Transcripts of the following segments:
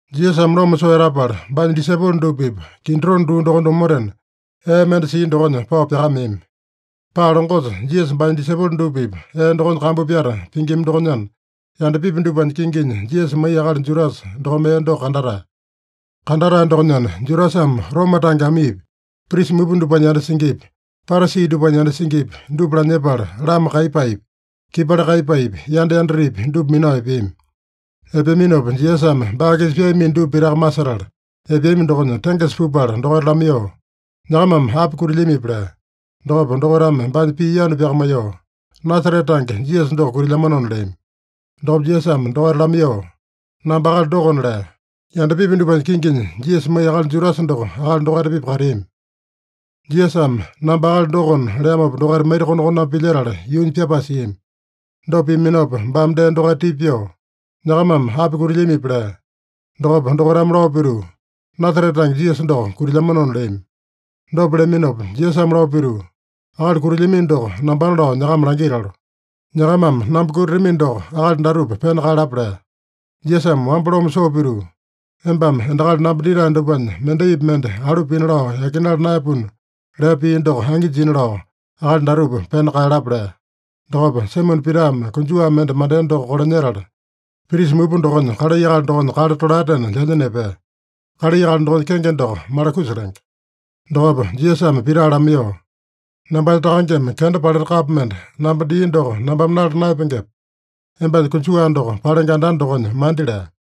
Jisasame loma soo etapala, baanya disaipolo dupa-pipa Kidrone duu dokonya omotena, ee mende sia dokonya pao pyakameami. Paa longosa Jisasa baanya disaipolo dupa-pipa ee dokonya kambu pyata pingima dokonyana, yandapipi dupanya kinginya Jisasa maiya akali Judasa dokome ee doko kandatae. Kandatae dokonyana, Judasame Roma tange amiipi, prisa mupa dupanya yanda singipi, Parasi dupanya yanda singipi, dupa lanyepala, lama kaiyapaepi, kipali kaiyapaepi, yanda yandatepi dupa minao epeami. Epeaminopa Jisasame baa-kisa pyaamino dupa pitaka masetala, epeami dokonya tengesa pupala dokaita lamaiyoo, “Nyakamame api kutilyamipi?” lea. Dokopa dokaitame baanya pii yanu pyakamaiyoo, “Nasarete tange Jisasa doko kutilyamanona” leami. Dokopa Jisasame dokaita lamaiyoo, “Namba akali dokona” lea. (Yandapipi dupanya kinginya Jisasa maiya akali Judasa doko akali dokaita-pipa kateami.) Jisasame “Namba akali dokona” leamopa, dokaita maita-konakoname pilyetala yuunya pyapae siami. Dopa piaminopa baame dee dokaita tipa pyoo, “Nyakamame api kutilyamipi?” lea. Dokopa dokaitame lao pituu, “Nasarete tange Jisasa doko kutilyamanona” leami. Dopa leaminopa Jisasame lao pituu, “Akali kutilyamino doko nambana lao nyakama langitalo. Nyakamame namba kutatamino doko, akali datupa pena kaeyalapa” lea. Jisasame wamba loma soo pituu, “Embame endakali namba ditae dupanya mendaipi mende alu pina lao yakinala naeyapuna” lea pii doko angi jina lao, “Akali datupa pena kaeyalapa” lea. Dokopa Saimone Pitame konjuwa mende mandea doko kolanyetala, prisa mupa dokonya kalai akali dokonya kale tolaetena lyanya nepea. (Kalai akali dokonya kenge doko Malakusa lenge.) Dokopa Jisasame Pita lamaiyoo, “Nambanya Takangeme kenda paleta kapo mende namba dia doko nambame nala naeyapengepe? Embanya konjuwa doko palenge andanda dokonya mandi” lea.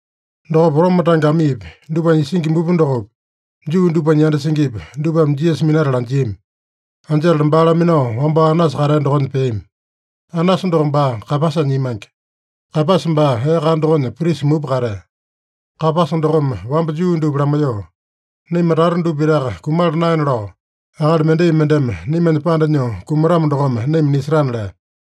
Dokopa Roma tange amiipi, dupanya isingi mupa dokopi, Juu dupanya yanda singipi, dupame Jisasa minatala anjiami. Anjetala baa laminao wambao Anasa katea dokonya peami. Anasa doko baa Kaeyapasanya imange. Kaeyapasa baa ee kana dokonya prisa mupa katea. (Kaeyapasa dokome wamba Juu dupa lamaiyoo, “Naima tata dupa pitaka kumala naena lao, akali mendai mendeme naimanya panda nyoo kumatamo dokome naima nisetana” lea.)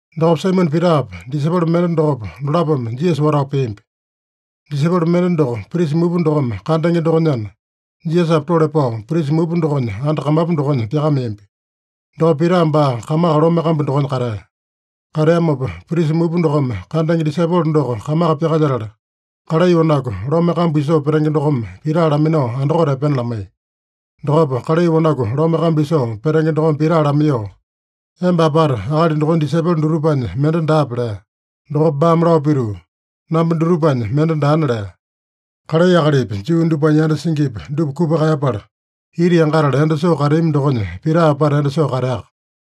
Dokopa Saimone Pitapa, disaipolo mende dokopa, dolapome Jisasa watao peambi. Disaipolo mende doko prisa mupa dokome kandenge dokonyana, Jisasapa tole pao prisa mupa dokonya anda kamapu dokonya pyakameambi. Dokopa Pita baa kamaka lome kambu dokonya katea. Kateamopa prisa mupa dokome kandenge disaipolo doko kamaka pyakalyetala, kalai wanaku lome kambu isoo petenge dokome Pita laminao andakote epena lamaiya. Dokopa kalai wanaku lome kambu isoo petenge dokome Pita lamaiyoo, “Emba apata akali dokonya disaipolo dutupanya mende daape?” lea. Dokopa baame lao pituu, “Namba dutupanya mende daana” lea. (Kalai akalipi, Juu dupanya yanda singipi, dupa kupa kaeyapala, ita yangatala endo soo kateami dokonya Pita apata endo soo kateaka.)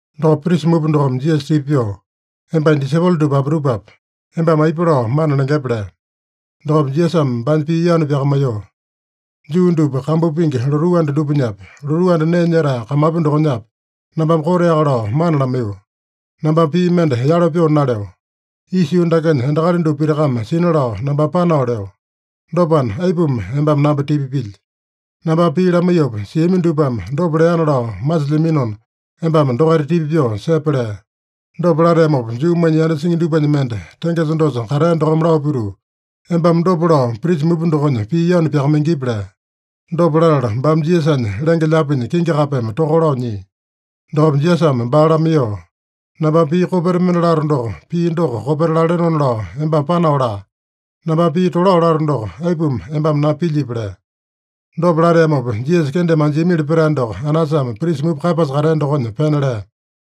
Dokopa prisa mupa dokome Jisasa tipa pyoo, “Embanya disaipolo dupa apitupape, embame aipa lao mana lengepe?” lea. Dokopa Jisasame baanya pii yanu pyakamaiyoo, “Juu dupa kambu pingi lotuu anda dupanyapi, lotuu anda nee nyetae kamapu dokonyapi, nambame koteaka lao mana lamaiyo. Nambame pii mende yalo pyoo naleo. Isa yuu dakenya endakali dupa pitakame sina lao nambame panao leo. Dopana, aipuma embame namba tipa pilyi? Nambame pii lamaiyopa siami dupame dopa leana lao masilyaminona, embame dokaita tipa pyoo sepe” lea. Dopa lateamopa Juumanya yanda singi dupanya mende, tengesa dosa katea dokome lao pituu, “Embame dopa lao prisa mupa dokonya pii yanu pyakamaingipi?” lea. Dopa latala baame Jisasanya lenge-lyaapinya kingi kapeme toka lao nyia. Dokopa Jisasame baa lamaiyoo, “Nambame pii kopeta mende lato doko, pii doko kopeta lalenona lao embame panao laa. Nambame pii tolao lato doko, aipuma embame namba pilyipi?” lea. Dopa lateamopa, Jisasa kendeme anjiamili petae doko Anasame prisa mupa Kaeyapasa katea dokonya pena lea.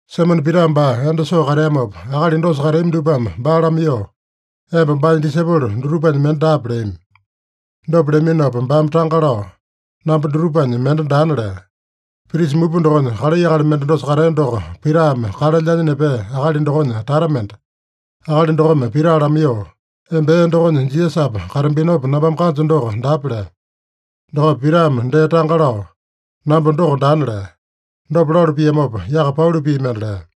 Saimone Pita baa endo soo kateamopa, akali dosa kateami dupame baa lamaiyoo, “Emba baanya disaipolo dutupanya mende daape?” leami. Dopa leaminopa baame tanga lao, “Namba dutupanya mende daana” lea. Prisa mupa dokonya kalai akali mende dosa katea doko Pitame kale lyanya nepea akali dokonya tata mende. Akali dokome Pita lamaiyoo, “Emba ee dokonya Jisasapa katambinopa nambame kanjo doko daape?” lea. Dokopa Pitame dee tanga lao, “Namba doko daana” lea. Dopa lalu piamopa, yaka pauli pii mende lea.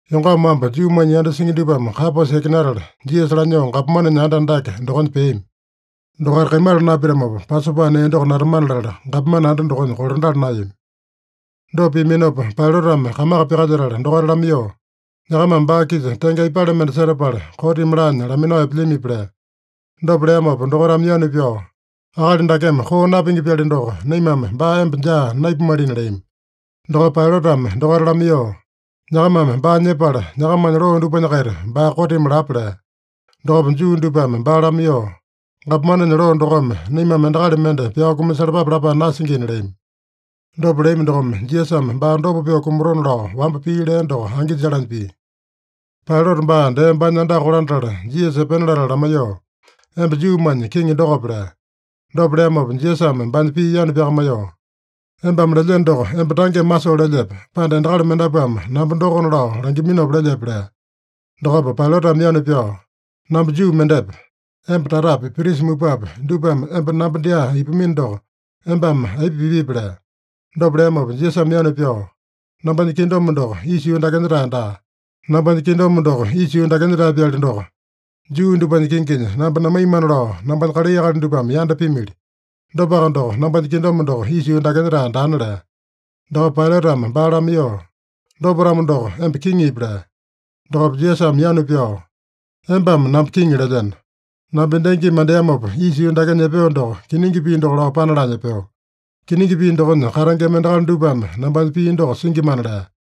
Yongama wamba Juumanya yanda singi dupame Kaeyapasa yakinatala, Jisasa lanyoo gapomanenya anda andake dokonya peami. Dokaita kaimala napitamopa, Pasopa nee doko natamana latala, gapomane anda dokonya kolandala naeyami. Dopa piaminopa Pailatame kamaka pyakalyetala dokaita lamaiyoo, “Nyakamame baa-kisa tenge aipale mende setapala, kotimi laanya laminao epelyamipi?” lea. Dopa leamopa dokaitame yanu pyao, “Akali dakeme koo napingi-pyali doko, naimame baa emba dyaa naipumalina” leami. Dokopa Pailatame dokaita lamaiyoo, “Nyakamame baa nyepala, nyakamanya loo dupanya-kaita baa kotimi lapa” lea. Dokopa Juu dupame baa lamaiyoo, “Gapomanenya loo dokome naimame endakali mende pyao kumasalapape lapae nasingina” leami. Dopa leami dokome, Jisasame baa dopa pyoo kumatona lao wamba pii lea doko angi jalanya pia. Pailata baa dee baanya andaka kolandatala, Jisasa epena latala lamaiyoo, “Emba Juumanya Kiŋi dokope?” lea. Dopa leamopa Jisasame baanya pii yanu pyakamaiyoo, “Embame lelyeno doko, emba tangeme masoo lelyepe, pande endakali mendapuame namba dokona lao langiminopa lelyepe?” lea. Dokopa Pailatame yanu pyao, “Namba Juu mendepe? Emba tatapi, prisa mupapi, dupame emba namba dyaa ipamino doko, embame aipa pipipi?” lea. Dopa leamopa Jisasame yanu pyao, “Nambanya kingdom doko isa yuu dakenya-tae daa. Nambanya kingdom doko isa yuu dakenya-tae-pyali doko, Juu dupanya kinginya namba namaina lao, nambanya kalai akali dupame yanda pimili. Dopaka doko, nambanya kingdom doko isa yuu dakenya-tae daana” lea. Dokopa Pailatame baa lamaiyoo, “Dopa-tamo doko, emba kiŋipi?” lea. Dokopa Jisasame yanu pyao, “Embame namba kiŋi lelyeno. Namba endangimi mandeamopa isa yuu dakenya epeo doko, kiningi pii doko lao panalanya epeo. Kiningi pii dokonya katengema endakali dupame nambanya pii doko singimana” lea.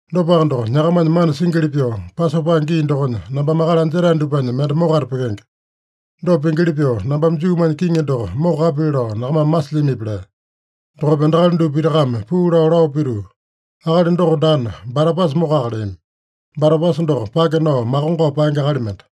Dopaka doko, nyakamanya mana singili pyoo, Pasopa gii dokonya nambame akali anjetae dupanya mende mokata pyekenge. Dopa pingili pyoo, nambame Juumanya Kiŋi doko mokokapili lao nyakamame masilyamipi?” lea. Dokopa endakali dupa pitakame puu lao, lao pituu, “Akali doko daana, Barabasa mokoka” leami. (Barabasa doko pake nao makongao paenge akali mende.)